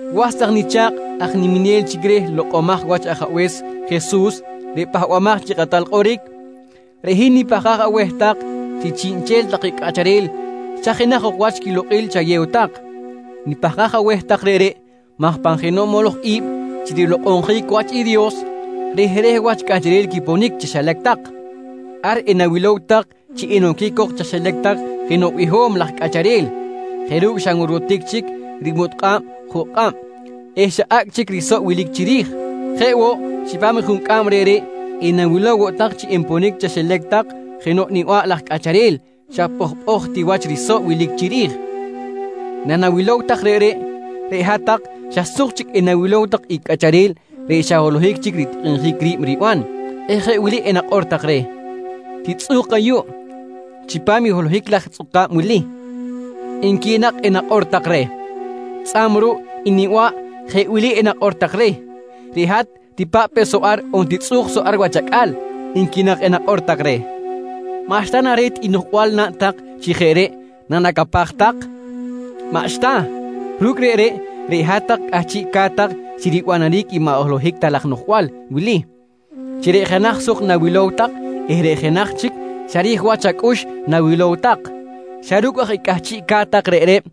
Was tak nicha̱kꞌ aj niminel chic reh lokꞌomaj wach Ajabe̱s Jesus reꞌ Pahbamaj chi Kꞌatal Kꞌoric, reꞌ hin nipahkaj aweh tak chi chiꞌnchel take cꞌacharel xa jenaj ok wach quilokꞌil chayew tak. Nipahkaj aweh tak reꞌreꞌ maj pan jenoꞌ moloj i̱b chi rilokꞌonjic wach i Dios, rehreh wach cꞌacharel quiponic chaxilac tak. Ar enawilow tak chi enoquic cok chaxilac tak jenoꞌ biho̱m laj cꞌacharel jeꞌ ru̱cꞌ xa nworwotic chic rimutkꞌa̱b juꞌ kꞌab eh xa acꞌ chic risoꞌ wilic chiri̱j. Jeꞌ woꞌ chipam i juncꞌam reꞌreꞌ enawilow woꞌ tak chi enponic chaxilac tak jenoꞌ niba̱ꞌ laj cꞌacharel xa pꞌojpꞌoj ti wach risoꞌ wilic chiri̱j. Nanawilow take reꞌreꞌ, reꞌ hat-tak xa suk chic enawilow tak i cꞌacharel reꞌ xa holohic chic ritikꞌinjic ri̱b riban eh jeꞌ wili enakꞌor tak reh: «Titzꞌu̱k ayuꞌ chipam i holohic laj tzꞌuka̱b wili, nqui nak enakꞌor tak reh. Tzꞌa̱b ruꞌ i niba̱ꞌ jeꞌ wili enakꞌor tak reh: «Reꞌ hat tipa̱ꞌ pe soꞌ ar on titzꞌu̱k soꞌ ar wach acꞌal, nqui nak enakꞌor tak reh. Maꞌxta na re̱t i noꞌjbal naꞌn tak chi jeꞌ reꞌ nanacapaj tak? Maꞌxta! Ru̱cꞌ reꞌreꞌ, reꞌ hat-tak cꞌahchiꞌca̱t tak chi ribanaric i maꞌ holohic ta laj noꞌjbal wili chi reꞌ jenaj suk nawilow tak eh reꞌ jenaj chic xa ri̱j wach acꞌux nawilow tak. Xa ru̱cꞌ aj i cꞌahchiꞌca̱t tak reꞌreꞌ,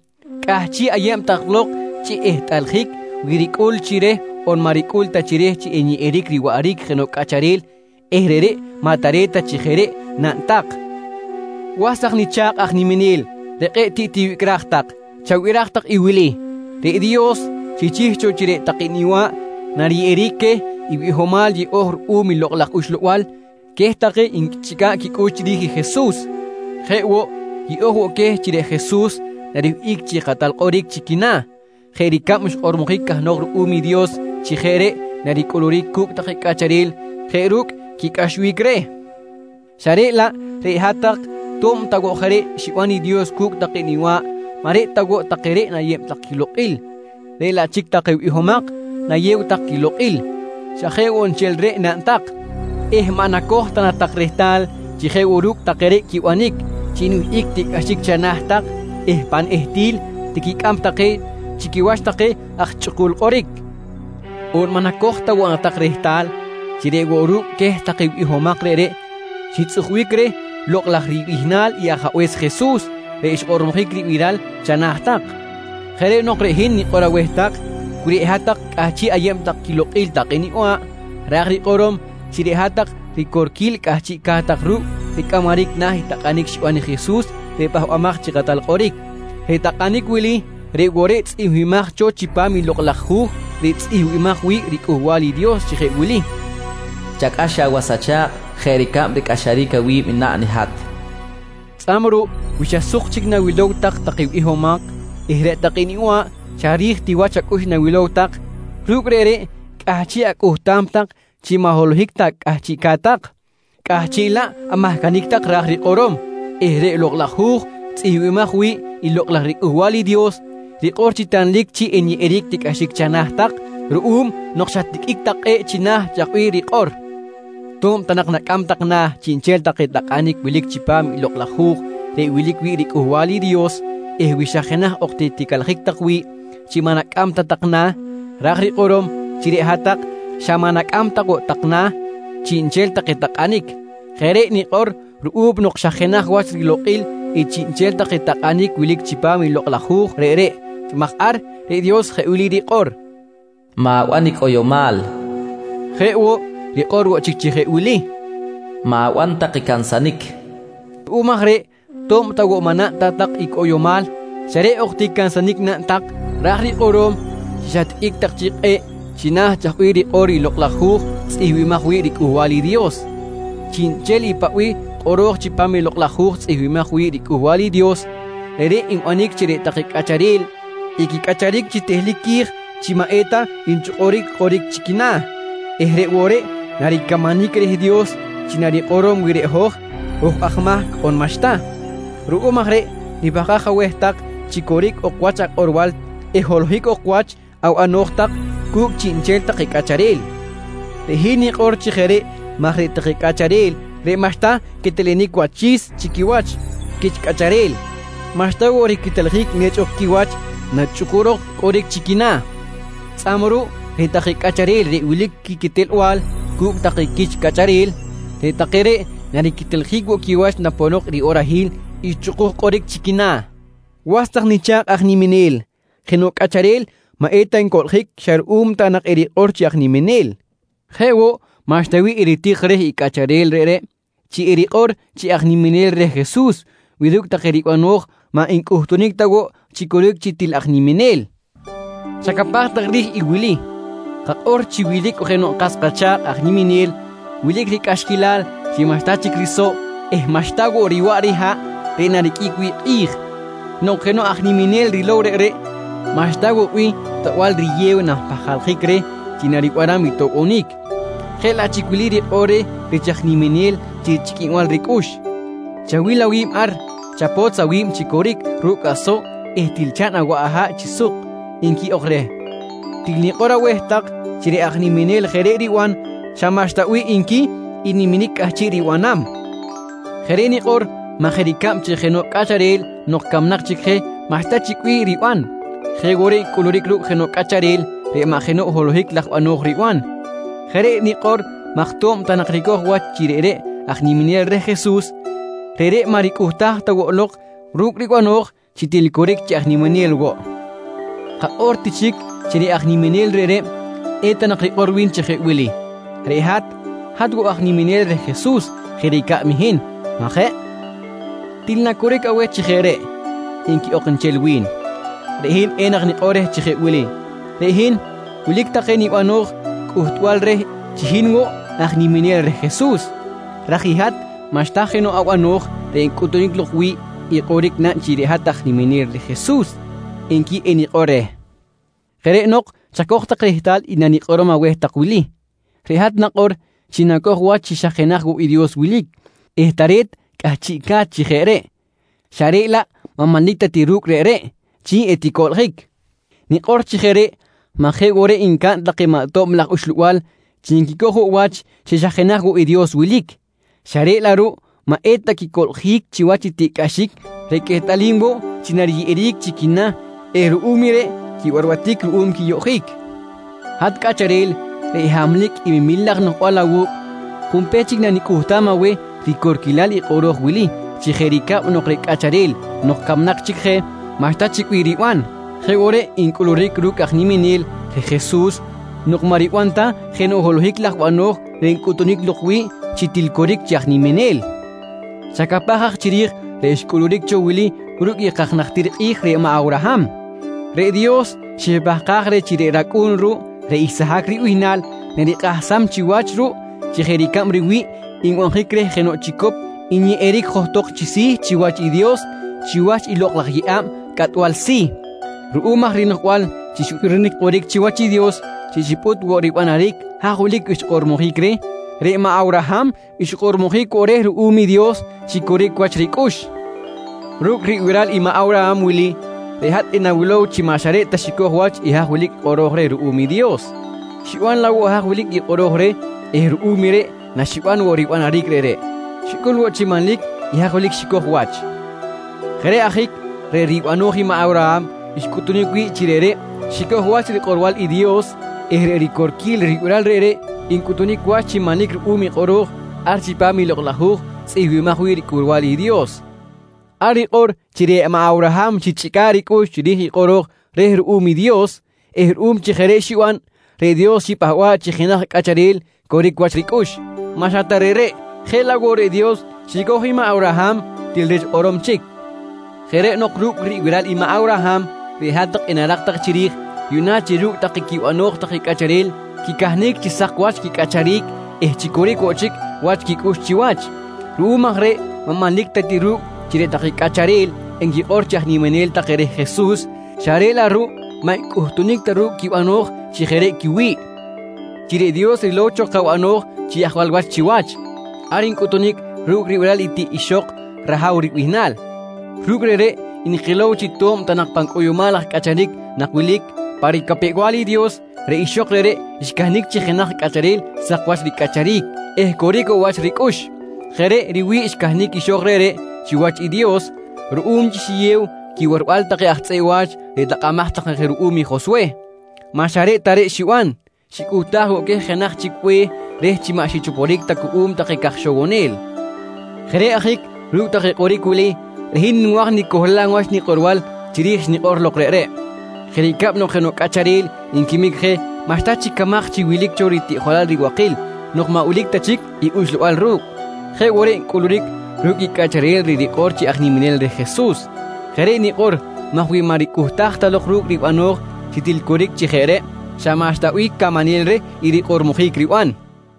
cꞌahchiꞌ ayeb tak lok chi ehtꞌaljic wi ricꞌul chi reh on maꞌ ricꞌul chi reh chi enyeꞌeric riwaꞌric jenoꞌ cꞌacharel eh reꞌreꞌ maꞌ tare̱t ta chi jeꞌ reꞌ naꞌn tak. Was tak nicha̱kꞌ aj niminel reꞌ kꞌe̱ꞌ tiꞌ tiwicꞌraj tak, chabiraj tak i wili: Reꞌ Dios xichih cho chi reꞌ take niba̱ꞌ nariyeꞌeric queh i bihomal yeꞌo̱j ruꞌum i Lokꞌ laj Uxlabal queh take nquichꞌica̱ꞌ quicꞌux chiri̱j i Jesus. Jeꞌ woꞌ, yeꞌo̱j woꞌ queh chi reꞌ Jesus nariwihꞌic chi Kꞌatal Kꞌoric chi quina̱ jeꞌ ricab xkꞌormojic cahnok ruꞌum i Dios chi jeꞌ reꞌ naricꞌuluric cu̱cꞌ take cꞌacharel jeꞌ ru̱cꞌ quicꞌaxbic reh. Xa reꞌ laꞌ reꞌ hat-tak to̱b ta woꞌ jeꞌ reꞌ xiban i Dios cu̱cꞌ take niba̱ꞌ maꞌ reꞌ ta woꞌ take reꞌ nayew tak quilokꞌil reꞌ laꞌ chic take bihomak nayew tak quilokꞌil. Xa jeꞌ woꞌ nchel reꞌ naꞌn tak eh maꞌ nacoj ta na tak rehtal chi jeꞌ woꞌ ru̱cꞌ take reꞌ quibanic chi nwihꞌic tiꞌcꞌaxic chana̱ tak eh pan ehtil tiquicꞌam tak je chi quiwach take aj chꞌukul kꞌoric? On maꞌ nacoj ta woꞌ na tak rehtal chi reꞌ woꞌ ru̱cꞌ queh take bihomak reꞌreꞌ xitzꞌujbic reh lokꞌ laj ribihnal i Ajabe̱s Jesus reꞌ xkꞌormojic ribiral chana̱ tak? Jeꞌ reꞌ nok reꞌ hin nikꞌor aweh tak wi reꞌ hat-tak cꞌahchiꞌ ayeb tak quilokꞌil take niba̱ꞌ, ra̱j rikꞌorom chi reꞌ hat-tak ricorquil cꞌahchiꞌca̱t ru̱cꞌ ricꞌamaric na̱ i takꞌanic xiban i Jesus reꞌ Pahbamaj chi Kꞌatal Kꞌoric. Reꞌ takꞌanic wili reꞌ woꞌ reꞌ tzꞌihmbimaj cho chipam i Lokꞌ laj Hu̱j reꞌ tzꞌihmbimaj wi̱ꞌ riCꞌuhbal i Dios chi jeꞌ wili: «Chacꞌax awas acha̱kꞌ jeꞌ ricab ricꞌaxaric awi̱b naꞌn i hat, nqui rikꞌor. Tzꞌa̱b ruꞌ wi xa suk chic nawilow tak take bihomak eh reꞌ take niba̱ꞌ xa ri̱j ti wach acꞌux nawil tak, ru̱cꞌ reꞌreꞌ cꞌahchiꞌ acꞌuhtam tak chi maꞌ holohic ta cꞌahchiꞌca̱t tak, cꞌahchiꞌ laꞌ amahcanic tak ra̱j rikꞌorom eh reꞌ Lokꞌ laj Hu̱j tzꞌihmbimaj wi̱ꞌ i Lokꞌ laj riCꞌuhbal i Dios rikꞌor chi tanlic chi enyeꞌeric tiꞌcꞌaxic chana̱ tak ruꞌum nok xatiqꞌuic tak kꞌe̱ꞌ china̱ chaj bih rikꞌor. To̱b ta nak nacꞌam tak na̱ chiꞌnchel take takꞌanic wilic chipam i Lokꞌ laj Hu̱j reꞌ wilic wi̱ꞌ riCꞌuhbal i Dios eh wi xa jenaj ok ti ticalajic tak wi̱ꞌ chi maꞌ nacꞌam ta tak na̱, ra̱j rikꞌorom chi reꞌ hat-tak xa maꞌ nacꞌam ta woꞌ tak na̱ chiꞌnchel take takꞌanic. Jeꞌ reꞌ nikꞌor ruꞌum nok xa jenaj wach rilokꞌil i chiꞌnchel take takꞌanic wilic chipam i lokꞌ laj hu̱j reꞌreꞌ maj ar reꞌ Dios jeꞌ wili rikꞌor: “Ma̱ban i cꞌoyomal, nqui rikꞌor. Jeꞌ woꞌ, rikꞌor woꞌ chic chi jeꞌ wili: “Ma̱ban tak i cansanic, nqui rikꞌor. Ruꞌum aj reꞌ to̱b ta woꞌ maꞌ naꞌn ta tak i cꞌoyomal xa reꞌ ok ti cansanic naꞌn tak, ra̱j rikꞌorom chi xatiqꞌuic tak chic kꞌe̱ꞌ china̱ chaj bih rikꞌor i Lokꞌ laj Hu̱j tzꞌihmbimaj wi̱ꞌ riCꞌuhbal i Dios. Chiꞌnchel i paꞌ bih kꞌoro̱j chipam i Lokꞌ laj Hu̱j tzꞌihmbimaj wi̱ꞌ riCꞌuhbal i Dios, reꞌreꞌ nbanic chi reꞌ take cꞌacharel equicꞌacharic chi tehlic qui̱j chi maꞌ eta nchꞌukuric kꞌoric chi quina̱ eh reꞌ woꞌ reꞌ naricamanic reh Dios chi narikꞌorom wi reꞌ hoj, hoj aj mahc on maꞌxta. Ruꞌum aj reꞌ nipahkaj aweh tak chi coric ok wach akꞌorbal eh holohic ok woꞌ wach abano̱j tak cu̱cꞌ chiꞌnchel take cꞌacharel. Reꞌ hin nikꞌor chi jeꞌ reꞌ maj reꞌ take cꞌacharel reꞌ maꞌxta quetelenic wachi̱s chi quiwach cu̱cꞌ quich cꞌacharel, maꞌxta woꞌ riqueteljic nechꞌ ok quiwach nachꞌukurok kꞌoric chi quina̱. Tzꞌa̱b ruꞌ reꞌ take cꞌacharel reꞌ wilic quiquetelbal cu̱cꞌ take quich cꞌacharel, reꞌ take reꞌ nariqueteljic woꞌ quiwach naponok riꞌorahil i chꞌukuj kꞌoric chi quina̱. Was tak nicha̱kꞌ aj niminel, jenoꞌ cꞌacharel maꞌeta ncoꞌljic xa ruꞌum ta nak erikꞌor chi aj niminel. Jeꞌ woꞌ, maꞌxta bih eritik reh i cꞌacharel reꞌreꞌ chi erikꞌor chi aj niminel reh Jesus wi ru̱cꞌ take ribano̱j maꞌ ncꞌuhtunic ta woꞌ chi coric chi til aj niminel. Chacapaj tak ri̱j i wili: Kakꞌor chi wilic jenoꞌ kas kacha̱kꞌ aj niminel wilic ricꞌaxquilal chi maꞌxta chic risoꞌ eh maꞌxta woꞌ riwaꞌ riha̱ꞌ reꞌ nariqꞌuic wi̱ꞌ kꞌi̱j. Nok jenoꞌ aj niminel rilow reꞌreꞌ, maꞌxta woꞌ bih toꞌbal riyew nanpahkaljic reh chi naribanam i toꞌbonic, jeꞌ laꞌ chic wili rikꞌor reh rich aj niminel chi chꞌiquinbal ricꞌux: «Chawil awi̱b ar, chapotz awi̱b chi coric ru̱cꞌ asoꞌ eh til chaꞌn awaꞌ aha̱ꞌ chi suk, nqui ok reh. Til nikꞌor aweh tak chi reꞌ aj niminel jeꞌ reꞌ riban, xa maꞌxta bih nqui i niminic cꞌahchiꞌ ribanam. Jeꞌ reꞌ nikꞌor maj jeꞌ ricab chi jenoꞌ cꞌacharel nok camnak chic je maꞌxta chic bih riban, jeꞌ woꞌ reꞌ ncꞌuluric ru̱cꞌ jenoꞌ cꞌacharel reꞌ maꞌ jenoꞌ holohic laj bano̱j riban. Jeꞌ reꞌ nikꞌor maj to̱b ta nak ricoj wach chi reꞌreꞌ aj niminel reh Jesus, reꞌreꞌ maꞌ ricꞌuhtaj ta woꞌ lok ru̱cꞌ ribano̱j chi til coric chi aj niminel woꞌ. Kakꞌor ti chic chi reꞌ aj niminel reꞌreꞌ, eta nak rikꞌor wi̱n chi jeꞌ wili: «Reꞌ hat, hat woꞌ aj niminel reh i Jesus jeꞌ ricab i hin, maꞌ jeꞌ? Til na coric aweh chi jeꞌ reꞌ? nqui ok nchel wi̱n. Reꞌ hin enak nikꞌor reh chi jeꞌ wili: «Reꞌ hin wilic take nibano̱j cꞌuhtbal reh chi hin woꞌ aj niminel reh Jesus, raj i hat maꞌxta jenoꞌ abano̱j reꞌ encꞌutunic lok wi̱ꞌ i kꞌoric naꞌn chi hat aj niminel reh Jesus, nqui enikꞌor reh. Jeꞌ reꞌ nok chacoj rehtal i nikꞌorom aweh tak wili: Reꞌ hat nakꞌor chi naco̱j wach chi xa jenaj woꞌ i Dios wilic eh tare̱t cꞌahchiꞌca̱t chi jeꞌ reꞌ, xa reꞌ laꞌ maꞌ manlic ta ti ru̱cꞌ reꞌreꞌ chi eticoꞌljic. Nikꞌor chi jeꞌ reꞌ maj jeꞌ woꞌ reꞌ ncaꞌn take maꞌ tob laj uxlabal chi nquicoj woꞌ wach chi xa jenaj woꞌ i Dios wilic, xa reꞌ laꞌ ruꞌ maꞌ eta quicoꞌljic chiwach i tiꞌcꞌaxic reꞌ quehtꞌalim woꞌ chi nariyeꞌeric chi quina̱ eh ruꞌum i reꞌ quibarbatic ruꞌum quiyoꞌjic. Hat cꞌacharel reꞌ hamlic i memil laj noꞌjbal awu̱cꞌ, junpech chic nanicꞌuhtam aweh ricorquilal i kꞌoro̱j wili chi jeꞌ ricab nok reꞌ cꞌacharel nok camnak chic je maꞌxta chic bih riban, jeꞌ woꞌ reꞌ ncꞌuluric ru̱cꞌ i aj niminel reh Jesus nok maꞌ riban jenoꞌ holohic laj bano̱j reꞌ ncꞌutunic lok wi̱ꞌ chi til coric chi aj niminel. Chacapaj aj chiri̱j reꞌ xcꞌuluric cho wili ru̱cꞌ i kaj najtir kꞌi̱j reꞌ maꞌ Awraham: Reꞌ Dios xipahkaj reh chi reꞌ racꞌu̱n ruꞌ reꞌ Isahac ribihnal narikꞌahsam chiwach ruꞌ chi jeꞌ ricab riwi̱ꞌ nbanjic reh jenoꞌ chicop nyeꞌeric johtok chi si̱ chiwach i Dios chiwach i lokꞌ laj yeꞌa̱b cꞌatbal si̱. Ruꞌum aj rinoꞌjbal chi xbirinic kꞌoric chiwach i Dios chi xipꞌut woꞌ ribanaric haj wilic xkꞌormojic reh, reꞌ maꞌ Awraham xkꞌormojic woꞌ reh ruꞌum i Dios chi coric wach ricꞌux. Ru̱cꞌ ribiral i maꞌ Awraham wili, reꞌ hat enawilow chi maꞌ xa reꞌ ta xicoj wach i haj wilic i kꞌoro̱j reh ruꞌum i Dios, xiban laꞌ woꞌ haj wilic i kꞌoro̱j reh eh ruꞌum reꞌ naxiban woꞌ ribanaric reꞌreꞌ, xicꞌul woꞌ chi manlic i haj wilic i xicoj wach. Jeꞌ reꞌ ajic reꞌ ribano̱j i maꞌ Awraham xcꞌuhtunic wi̱ꞌ chi reꞌreꞌ xicoj wach rikꞌorbal i Dios eh reꞌ ricorquil ribiral reꞌreꞌ ncꞌutunic wach chi manlic ruꞌum i kꞌoro̱j ar chipam i Lokꞌ laj Hu̱j tzꞌihmbimaj wi̱ꞌ riCꞌuhbal i Dios. Ar rikꞌor chi reꞌ maꞌ Awraham xichꞌica̱ꞌ ricꞌux chiri̱j i kꞌoro̱j reh ruꞌum i Dios eh ruꞌum chi jeꞌ reꞌ xiban, reꞌ Dios xipahba̱ꞌ chi jenaj cꞌacharel coric wach ricꞌux. Maꞌ xa ta reꞌreꞌ, jeꞌ laꞌ woꞌ reꞌ Dios xicoj i maꞌ Awraham til rich kꞌorom chic! Jeꞌ reꞌ nok ru̱cꞌ ribiral i maꞌ Awraham, reꞌ hat-tak enarak tak chiri̱j yuꞌna chi ru̱cꞌ take quibano̱j take cꞌacharel quicahnic chi sak wach quicꞌacharic eh chi coric woꞌ chic wach quicꞌux chiwach. Ruꞌum aj reꞌ maꞌ manlic ta ti ru̱cꞌ chi reꞌ take cꞌacharel enquikꞌor chi aj niminel take reh Jesus xa reꞌ laꞌ ruꞌ maꞌ ncꞌuhtunic ta ru̱cꞌ quibano̱j chi jeꞌ reꞌ quiwi̱ꞌ. Chi reꞌ Dios rilow cho kabano̱j chi ajwal wach chiwach, ar ncꞌutunic ru̱cꞌ ribiral i tiꞌ ixok Rahaw ribihnal. Ru̱cꞌ reꞌreꞌ nkilow chi to̱b ta nak pan cꞌoyomal laj cꞌacharic nak wilic, pa ricapew-bal i Dios reꞌ ixok reꞌreꞌ xcahnic chi jenaj cꞌacharel sak wach ricꞌacharic eh coric woꞌ wach ricꞌux. Jeꞌ reꞌ riwi̱ꞌ xcahnic ixok reꞌreꞌ chiwach i Dios ruꞌum chi xiyew quiwarbal take aj tzꞌeꞌ wa̱ch reꞌ takꞌamaj take je ruꞌum i Joswe. Maꞌ xa reꞌ ta reꞌ xiban, xicꞌuhtaj woꞌ queh jenaj chic be̱h reh chi maꞌ xichoporic cuꞌum take caj ixowonel. Jeꞌ reꞌ ajic ru̱cꞌ take kꞌoric wili, reꞌ hin nwa̱j nicohlam wach nikꞌorbal chiri̱j xnikꞌor lok reꞌreꞌ: Jeꞌ ricab nok jenoꞌ cꞌacharel nquimic je maꞌxta chic camaj chi wilic cho ritiꞌjolal ribakil nok maꞌ wilic ta chic i uxlabal ru̱cꞌ, jeꞌ woꞌ reꞌ ncꞌuluric ru̱cꞌ i cꞌacharel reꞌ rikꞌor chi aj niminel reh Jesus. Jeꞌ reꞌ nikꞌor maj wi maꞌ ricꞌuhtaj lok ru̱cꞌ ribano̱j chi til coric chi jeꞌ reꞌ, xa maꞌxta bih camanel reh i rikꞌormojic riban.